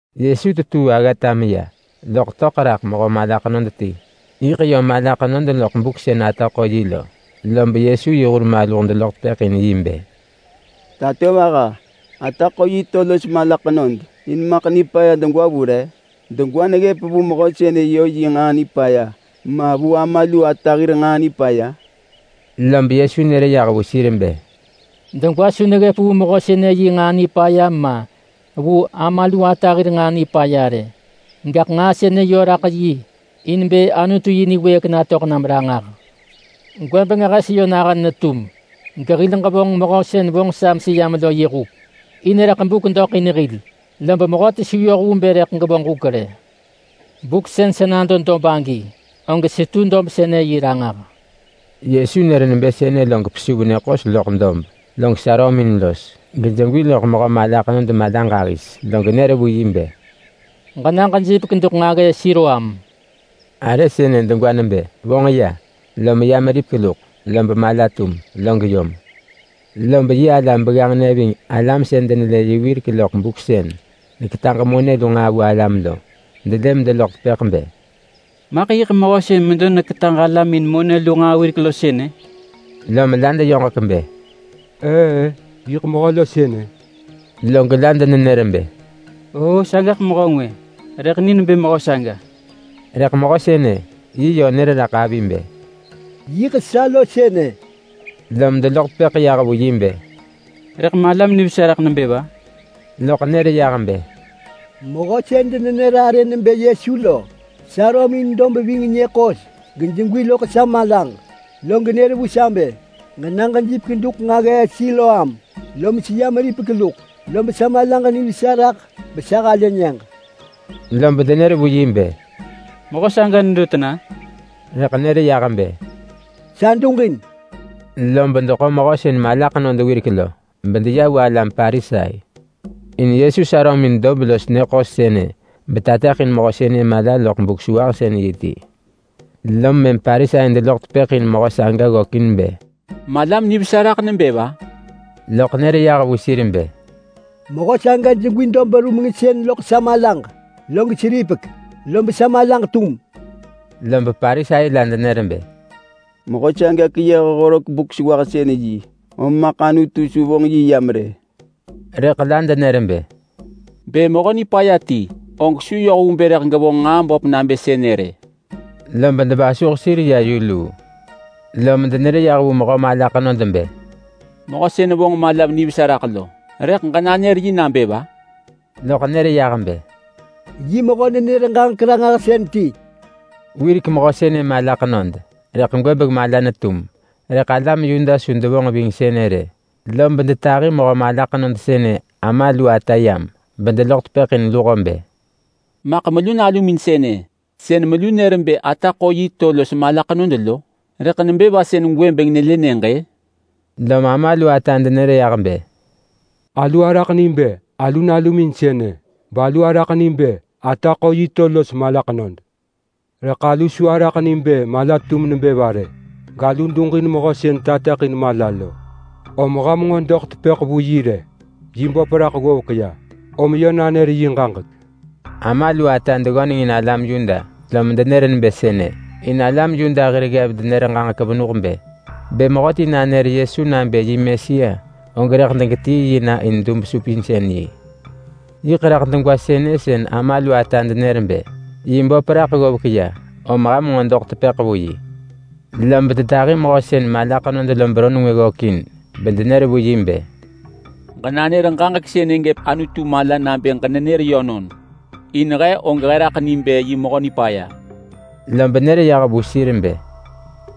Yesu tetuu aggata meya, loḳ töḳ raḳ mehö mala ḳenod ti. Yiḳ yö mala ḳenod loḳ buk sën ata ḳo yi lo. Lob Yesu yi hur maluh deloḳ tepëḳ in yi bë, “Tatovaha! Re vonġ nġaa nipaya lom sën ata ḳo yi to los mala ḳenod-a? Degwa neggëp vu mehö sënë yö yi nġaa nipaya, ma vu ama lu ata hir nġaa nipaya?” Lob Yesu nër yah vu sir bë, “Degwa su neggëp vu mehö sënë yi nġaa nipaya ma, vu ama lu ata hir nġaa nipaya rë! Gaḳ nġaa sënë yö raḳ yi in bë Anutu yi niwëëk natöḳ nam ranġah. Gwëbeng hes yö nahën netum, gehil ġevonġ Mehö sën vonġ sa meseyam lo yi huk. In rëḳ buk doḳ in hil, lob mehöti su yoh vu bë rëḳ gevonġ huk rë. Buk sën sa nado dob agi, og setu dob sënë yi Ranġah.” Yesu nër nebë sënë log pesuv nyë ḳos loḳ dob, log sarömin los, gejegwi loḳ mehö mala ḳenod mala ġahis, log nër vu yi bë, “Ġena ġejipek duḳ nġaggee Siloam!” (Arë sënë degwa nebë ‘Vonġ ya’). Lom ya meripek luḳ, lob mala tum, log yom. Lob yi alam begganġnë ving alam sën denelë yi wirek loḳ buk sën neketaġ monë lu nġaa vu alam lo delë medeloḳ tepëḳ bë, “Maḳ yiḳ mehö sën medo neketaġ alam in monë lu nġaa wirek lo sënë?” Lom la deyoġek bë, “Ëë-ë! Yiḳ mehö lo sënë!” Log la denenër bë, “Oo sagaḳ mehö ngwë, rëḳ ni nebë mehö saga!” Rëḳ mehö sënë yi yö nër raḳ avi bë, “Yiḳ sa lo sënë!” Lom deloḳ tepëḳ yah vu yi bë, “Rëḳ malam nivesa raḳ nebë va?” Loḳ nër yah bë, “Mehö sën denenër arë nebë Yesu lo sarömin dob ving nyë ḳos gejegwi loḳ sa malaġ, log nër vu sa bë, ‘Ġena ġejipek duḳ nġaggee Siloam!’ Lom seya meripek luḳ, lob sa malaġ nivesa raḳ besa halë nyëġ.” Lob denër vu yi bë, “Mehö saga nedo tena?” Rëḳ nër yah bë, “Sa duġin!” Lob deḳo mehö sën mala ḳenod wirek lo, bedeya vu alam Parisai. In Yesu sarömin dob los nyë ḳos sënë betateḳin mehö sënë mala loḳ Buk-sewahsën-yi ti. Lom mëm Parisai deloḳ tepëḳ in mehö saga ggökin bë, “Malam nivesa raḳ nebë va?” Loḳ nër yah vu sir bë, “Mehö saga jegwi dob rumengsën loḳ sa malaġ, log seripek, lob sa malaġ tum.” Lob Parisai la denër bë, “Mehö saga keyëh horek Buk-sewahsën-yi, om maḳ Anutu su vonġ yi yam rë.” Rëḳ la denër bë, “Bë mehö nipaya ti, og su yoh vu bë rëḳ gevonġ nġaa böp nabë sënë rë!” Lob devasuh sir ya yu luu. Lom denër yah vu mehö mala ḳenod bë, “Mehö sën vonġ malam nivesa raḳ lo, rëḳ ġenanër yi nabë va?” Loḳ nër yah bë, “Yi mehö-nenër-ġaġek-ranġahsën ti!” Wirek mehö sënë mala ḳenod, rëḳ gwëbeng mala netum, rëḳ alam Yuda su devonġ ving sënë rë. Lob detahi mehö mala ḳenod sënë ama lu ata yam, bedeloḳ tepëḳ in luho bë, “Maḳ melu nalumin sënë sën melu nër bë ata ḳo yi to los mala ḳenod lo? Rëḳ nebë va sën gwëbeng nelë nyëġ-ë?” Lom ama lu ata denër yah bë, “Alu araḳ ni bë alu nalumin sënë, balu araḳ ni bë ata ḳo yi to los mala ḳenod. Rëḳ alu su araḳ ni bë mala netum nebë va rë! Galu duġin mehö sën tateḳin mala lo. Om ham nġo doḳ tepëḳ vu yi rë. Yi böp raḳ ggovek ya, om yö nanër yi ġaġek!” Ama lu ata deggöneng in alam Yuda lom denër nebë sënë. In alam Yuda hir ggev denër ġaġek venuh bë: Bë mehöti nanër Yesu nabë yi Mesia, og rëḳ degetii yi na in dub-supinsën-yi. Yiḳ raḳ degwa sënë sën ama lu ata denër bë, “Yi böp raḳ ggovek ya, om ham nġo doḳ tepëḳ vu yi.” Lob detahi mehö sën mala ḳenod lo beron ngwë ggökin bedenër vu yi bë, “Ġenanër ġaġek sënë gëp Anutu mala nabë ġenenër yönon! In he og he raḳ ni bë yi mehö nipaya.” Lob nër yah vu sir bë,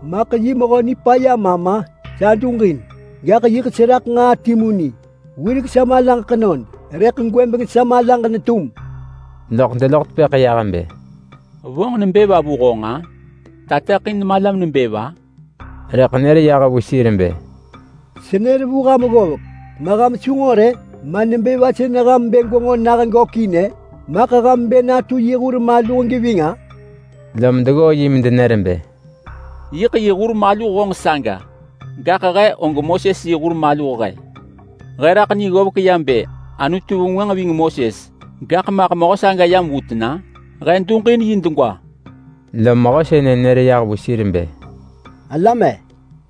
“Maḳ yi mehö nipaya ma ma? Sa duġin. Gaḳ yiḳ seraḳ nġaa timu ni. Wirek sa malaġ ḳenod, rëḳ gwëbeng sa malaġ netum.” Loḳ deloḳ tepëḳ yah bë, “Vonġ nebë va vu honġ-a? Tateḳin malam nebë va?” Rëḳ nër yah vu sir bë, “Senër vu ham ggovek, ma ham su nġo rë? Ma nebë va sën ham bë gwenġo nah gökin-ë? Maḳ ham bë natu yi hur maluh geving-a?” Lom deggoo yi medenër bë, “Yiḳ yi hur maluh honġ saga! Gaḳ he, og Moses yi hur maluh he! He raḳ ni ggovek ya bë Anutu vengwënġ ving Moses, gaḳ maḳ mehö saga yam vu tena? He duġin yi degwa.” Lom mehö sënë nër yah vu sir bë, “Alam-e!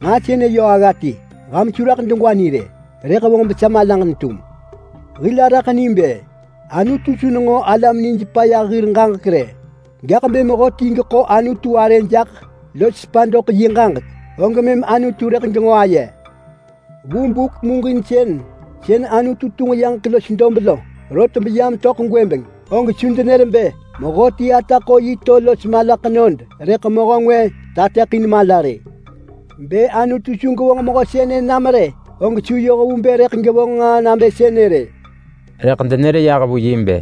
Nġaa sënë yö agga ti! Ham su raḳ degwa ni rë, rëḳ vonġ besa malaġ netum! Hil araḳ ni bë Anutu su nenġo alam nijpaya hir ġaġek rë, gaḳ bë mehöti geḳo Anutu arë jaḳ los sepa doḳ yi ġaġek lo, og mëm Anutu rëḳ genġo aye. Vu buk muġinsën sën Anutu tunġ yaġek los dob lo rot beyam töḳ gwëbeng, og su denër bë mehöti ata ḳo yi to los mala ḳenod rëḳ mehö ngwë tateḳin mala rë. Bë Anutu su gevonġ mehö sënë nam rë, og su yoh vu bë rëḳ gevonġ nġaa nabë sënë rë.” Rëḳ denër yah vu yi bë,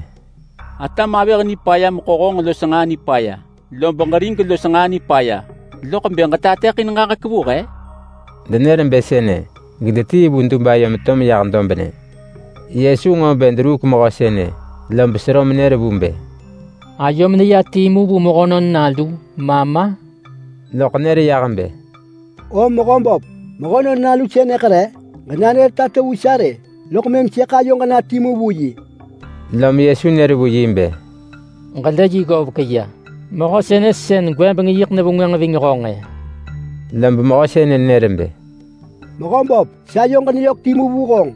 “Atam avëh nipaya meḳo honġ los nġaa nipaya, lob ġerig los nġaa nipaya, loḳ bë ġetateḳin ġaġek vu he?” Denër bë sënë gedetii vu dub ayo meto meyah dobnë. Yesu nġo bë deruuk mehö sënë, lob sero menër vu bë, “Ayom neya timu vu Mehönon Nalu, ma ma?” Loḳ nër yah bë, “O mehö böp, Mehönon Nalu sënëḳ re? Ġenanër tato vu sa rë, loḳ mëm sëḳ ayoġ na timu vu yi.” Lom Yesu nër vu yi bë, “Ġelë yi ggovek ya, mehö sënë sën gwëbeng yiḳ nevengwënġ ving honġ-ë!” Lob mehö sënë nër bë, “Mehöböp, sayoġ neyök timu vu honġ!”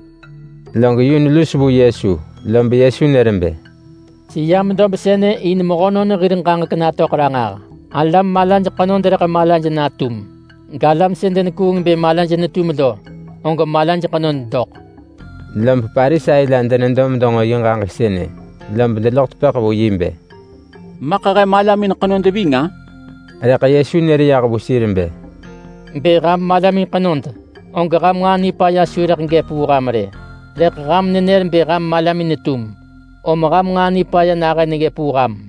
Log yun lus vu Yesu. Lob Yesu nër bë, “Seyam dob sënë in mehönon hir ġaġek natöḳ ranġah. Alam malaj ḳenod rëḳ malaj natum, galam sën denekuung bë malaj netum lo, og malaj ḳenod doḳ.” Lob Parisai la denedo medenġo yi ġaġek sënë, lob deloḳ tepëḳ vu yi bë, “Maḳ he malamin ḳenod ving-a?” Rëḳ Yesu nër yah vu sir bë, “Bë ham malamin ḳenod, og ham nġaa nipaya su rëḳ gëp vu ham rë. Rëḳ ham nenër bë ham malamin netum, om ham nġaa nipaya nahën neggëp vu ham!”